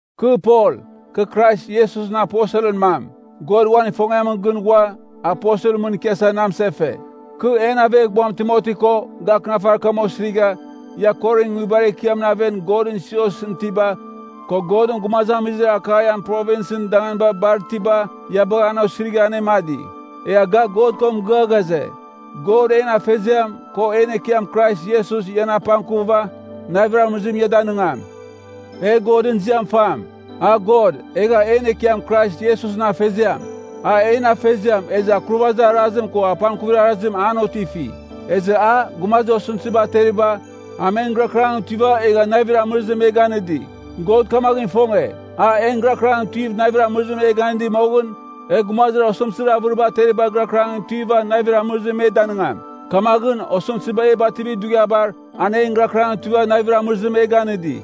Kɨ Pol, kɨ Krais Iesusɨn aposelɨn mam. God uan ifongiamɨn gɨn ghua, aposelɨn mɨn ikiasa na amɨsefe. Kɨ en aveghbuam Timoti ko, ga akɨnafarir kam osirigha, ia Korinɨn nguibar ekiamɨn aven Godɨn siosɨn itiba, ko Godɨn gumazamizir Akaian Provinsɨn danganiba bar itiba, ia bagha an osirigha anemadi. Egha ga God ko mɨgɨa ghaze, God en Afeziam, ko en Ekiam Krais Iesus ian apangkuva, navir amɨrɨzim ia danɨngam. E Godɨn ziam fam, a God, egha en Ekiam Krais Iesusɨn Afeziam. A en Afeziam, ezɨ akurvazir arazim ko apangkuvir arazim an otifi. Ezɨ a, gumazir osɨmtɨziba ateriba, a men gɨrakɨrangɨn tuiva egha navir amɨrɨzim me ganɨdi. God kamaghɨn ifonge, an en gɨrakɨrangɨn tuiva navir amɨrɨzim e ganɨdi moghɨn, e gumazir osɨmtɨzir avɨriba ateritabar gɨrakɨrangɨn tuiva navir amɨrɨzim me danɨngam. Kamaghɨn, osɨmtɨziba e bativir dughiabar, an en gɨrakɨrangɨn tuiva navir amɨrɨzim e ganɨdi.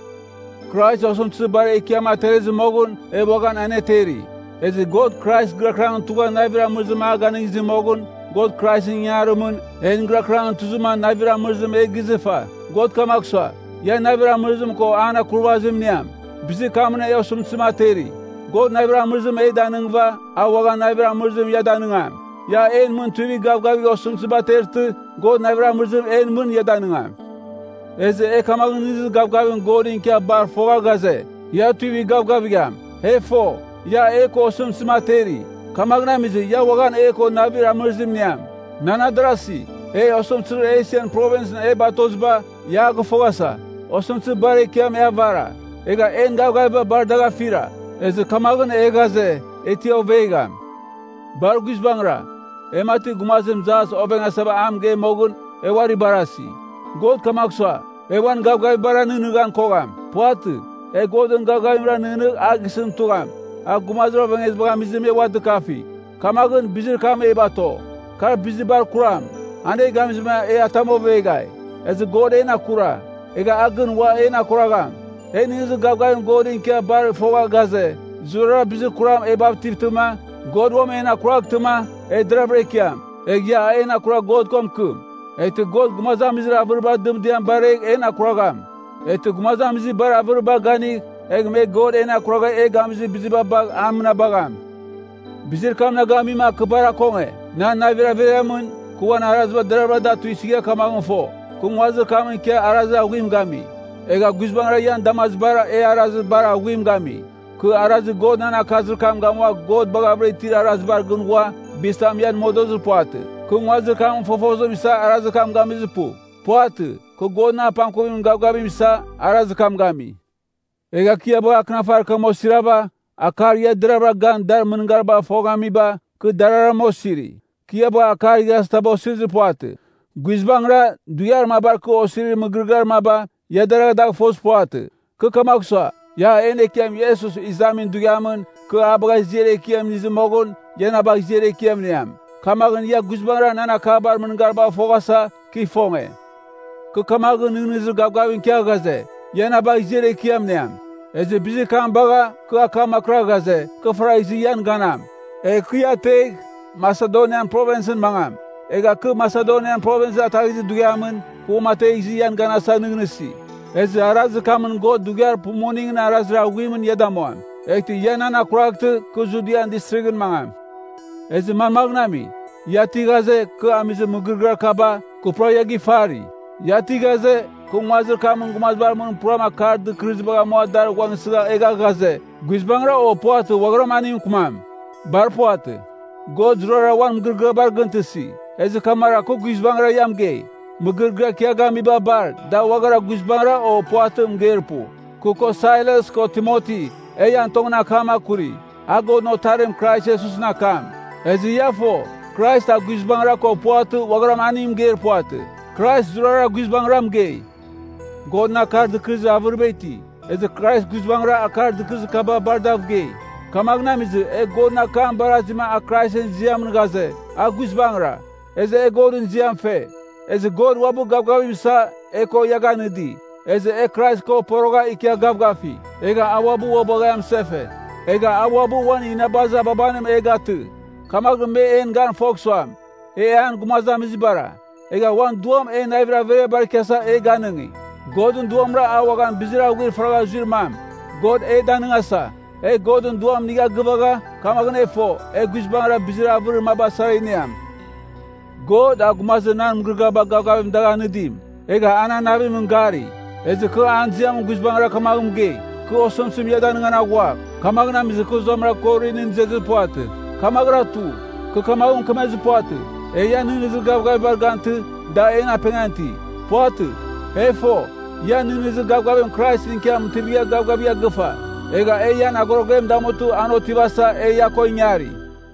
Krais osɨmtɨzir bar ekiam aterezɨ moghɨn e uaghan aneteri. Ezɨ God Krais gɨrakɨrangɨn tugha navir amɨrɨzim a ganɨngizɨ moghɨn, God Kraisɨn ingangarimɨn, en gɨrakɨrangɨn tuzɨma navir amɨrizim e gizɨva. God kamagh sua, ia navir amɨrɨzim ko an akurvazim iniam, bizir kamɨn e osɨmtɨzim ateri. God navir amɨrɨzim e danɨngɨva, a uaghan navir amɨrɨzim ia danɨngam. Ia en mɨn tuivigh gavgavigh osɨmtɨziba atertɨ, God navir amɨrɨzim en mɨn ia danɨngam. Ezɨ e kamaghɨn nɨghnɨzir gavgavim Godɨn ikia bar fogha ghaze, ia tuivigh gavgavigham. E fo, ia e ko osɨmtɨzim ateri, kamaghɨn amizɨ, ia uaghan e ko navir amɨrɨzim iniam. Nan adarasi, e osɨmtɨzir Esian Provinsɨn e batoziba, ia a gɨfoghasa. Osɨmtɨzir bar ekiam e avara, egha en gavgaviba bar dagh afira. Ezɨ kamaghɨn e ghaze, e ti ovegham. Bar guizbangɨra, e mati gumazim jas ovengasava a mɨgei moghɨn, e uari barasi. God kamagh sua, e uan gavgavibara nɨghnɨghan kogham. Puvatɨ, e Godɨn gavgavimra nɨghnɨgh a gisɨn tugham, a gumazir ovengezibagh amizɨ me ua dɨkafi. Kamaghɨn, bizir kam e bato. Kar bizir bar kuram, an e gamizɨ e atam oveghai. Ezɨ God en akura. Egh a gɨn uam en akuragham. E nɨghnɨzir gavgavim Godɨn ikia bar fogha ghaze, zurara bizir kuram e bativtɨma, God uam en akuraghtɨma, e deraghvɨra ikiam. Egh ia en akuragh God ko mɨkɨm. Eghtɨ God gumazamizir avɨribar dɨmdiaba baragh en akuragham. Eghtɨ gumazamizir bar avɨriba ganigh, egh me God en akuragha e gamizir biziba bagh a mɨnabagham. Bizir kam na gamima kɨ bar akonge. Nan navir averiamɨn, kɨ uan araziba deravɨra da tuisɨgha kamaghɨn fo, kɨ nguazir kamɨn ikia arazir aghuim gami, egha guizbangɨra ian damazibara e arazir bar aghuim gami. Kɨ arazir God nan akazir kam gamua God baghavɨra itir arazibar gɨn ghua, bizitam ian modozir puvatɨ. Kɨ nguazir kamɨn fofozim isa arazir kam gamizir pu. Puvatɨ, kɨ Godɨn apangkuvimɨn gavgavim isa, arazir kam gami. Egha kɨ ia bagha akɨnafarim osirava, akar ia deravɨra gan dar mɨngaribagh foghamiba, kɨ dararama osiri. Kɨ ia bagha akar igharazitaba osirir puvatɨ. Guizbangɨra, dughiar mabar kɨ osirir mɨgɨrɨgɨar maba, ia deragha dagh fozir puvatɨ. Kɨ kamagh sua, ia en Ekiam Iesus Izamin Dughiamɨn, kɨ ia bagha ziar ekiam inizɨ moghɨn, ia na bagh ziar ekiam iniam. Kamaghɨn ia guizbangɨra nan akabar mɨngaribagh foghasa, kɨ ifonge. Kɨ kamaghɨn nɨghnɨzir gavgavim ikia ghaze, ia na bagh ziar ekiam iniam. Ezɨ bizir kam bagha, kɨ akam akɨrigha ghaze, kɨ faragh izɨ ian ganam. Egh kɨ ia ategh, Masedonian Provinsɨn mangam. Egha kɨ Masedonia Provins ataghizir dughiamɨn, kɨ uamategh izɨ ian ganasa nɨghnɨsi. Ezɨ arazir kamɨn God dughiar pumuningɨn arazir aghuimɨn ia damuam. Eghtɨ ia nan akuraghtɨ, kɨ Judian Distrighɨn mangam. Ezɨ manmaghɨn ami? Ia ti ghaze, kɨ amizir mɨgɨrɨgɨar kaba, kɨ pura ia gifari. Ia ti ghaze, kɨ nguazir kamɨn gumazibar mɨn puram akar dɨkɨrɨzibagh amua dar ghuangsɨgha egha ghaze, “Guizbangɨra” o “Puvatɨ” uaghara aningɨn mɨkɨmam? Bar puvatɨ. God zurara uan mɨgɨrɨgɨabar gɨntɨsi. Ezɨ kamaghɨra kɨ guizbangɨra ia mɨgei, mɨgɨrɨgɨar kɨ ia gamiba bar, da uaghara “guizbangɨra” o “puvatɨ” mɨgeir pu. Kɨ, ko Sailas, ko Timoti, e ian tongɨn akam akuri, a Godɨn Otarim Krais Iesusɨn akam. Ezɨ ia fo, Krais a “guizbangɨra” ko “puvatɨ,” uagharam aningɨn mɨgeir puvatɨ. Krais zurara guizbangira mɨgei. Godɨn akar dɨkɨrɨzir avɨriba iti. Ezɨ Krais “guizbangɨra” akar dɨkɨrɨzir kaba bar dav gei. Kamaghɨn amizɨ, e Godɨn akam barazima a Kraisɨn ziamɨn ghaze, “A guizbangɨra,” ezɨ e Godɨn ziam fe. Ezɨ God uabɨ gavgavim isa, e ko ia ganɨdi, ezɨ e Krais ko porogha, ikia gavgafi. Egha a uabɨ ua bagha e amɨsefe. Egha a uabɨ uan inabazir ababanim e gatɨ, kamaghɨn me en gan fogh suam, e an gumazamizibara. Egha uan Duam en navir averiabar ikiasa an e ganɨngi. Godɨn Duamra a uaghan bizir aghuir faragha zuir mam, God e danɨngasa. E Godɨn Duam inigha gɨvagha, kamaghɨn e fo, e guizbangɨra bizir avɨrir maba sara iniam. God, a gumazir nan mɨgɨrɨgɨaba gavgavim dagh anɨdim, egha a nan navimɨn gari. Ezɨ kɨ an ziamɨn guizbangɨra kamaghɨn mɨgei, kɨ osɨmtɨzim ia danɨngan aghua, kamaghɨn amizɨ kɨ zuamɨra Korinɨn izezir puvatɨ. Kamaghɨra tu. Kɨ kamaghɨn mɨkemezir puvatɨ, e ian nɨghnɨzir gavgavibar gantɨ, da en apengan iti. Puvatɨ. E fo, ia nɨghnɨzir gavgavim Kraisɨn ikia mɨtivigha gavgavigha gɨfa. Egha e ian agorogem damutɨ, an otivasa, e ia ko ingari.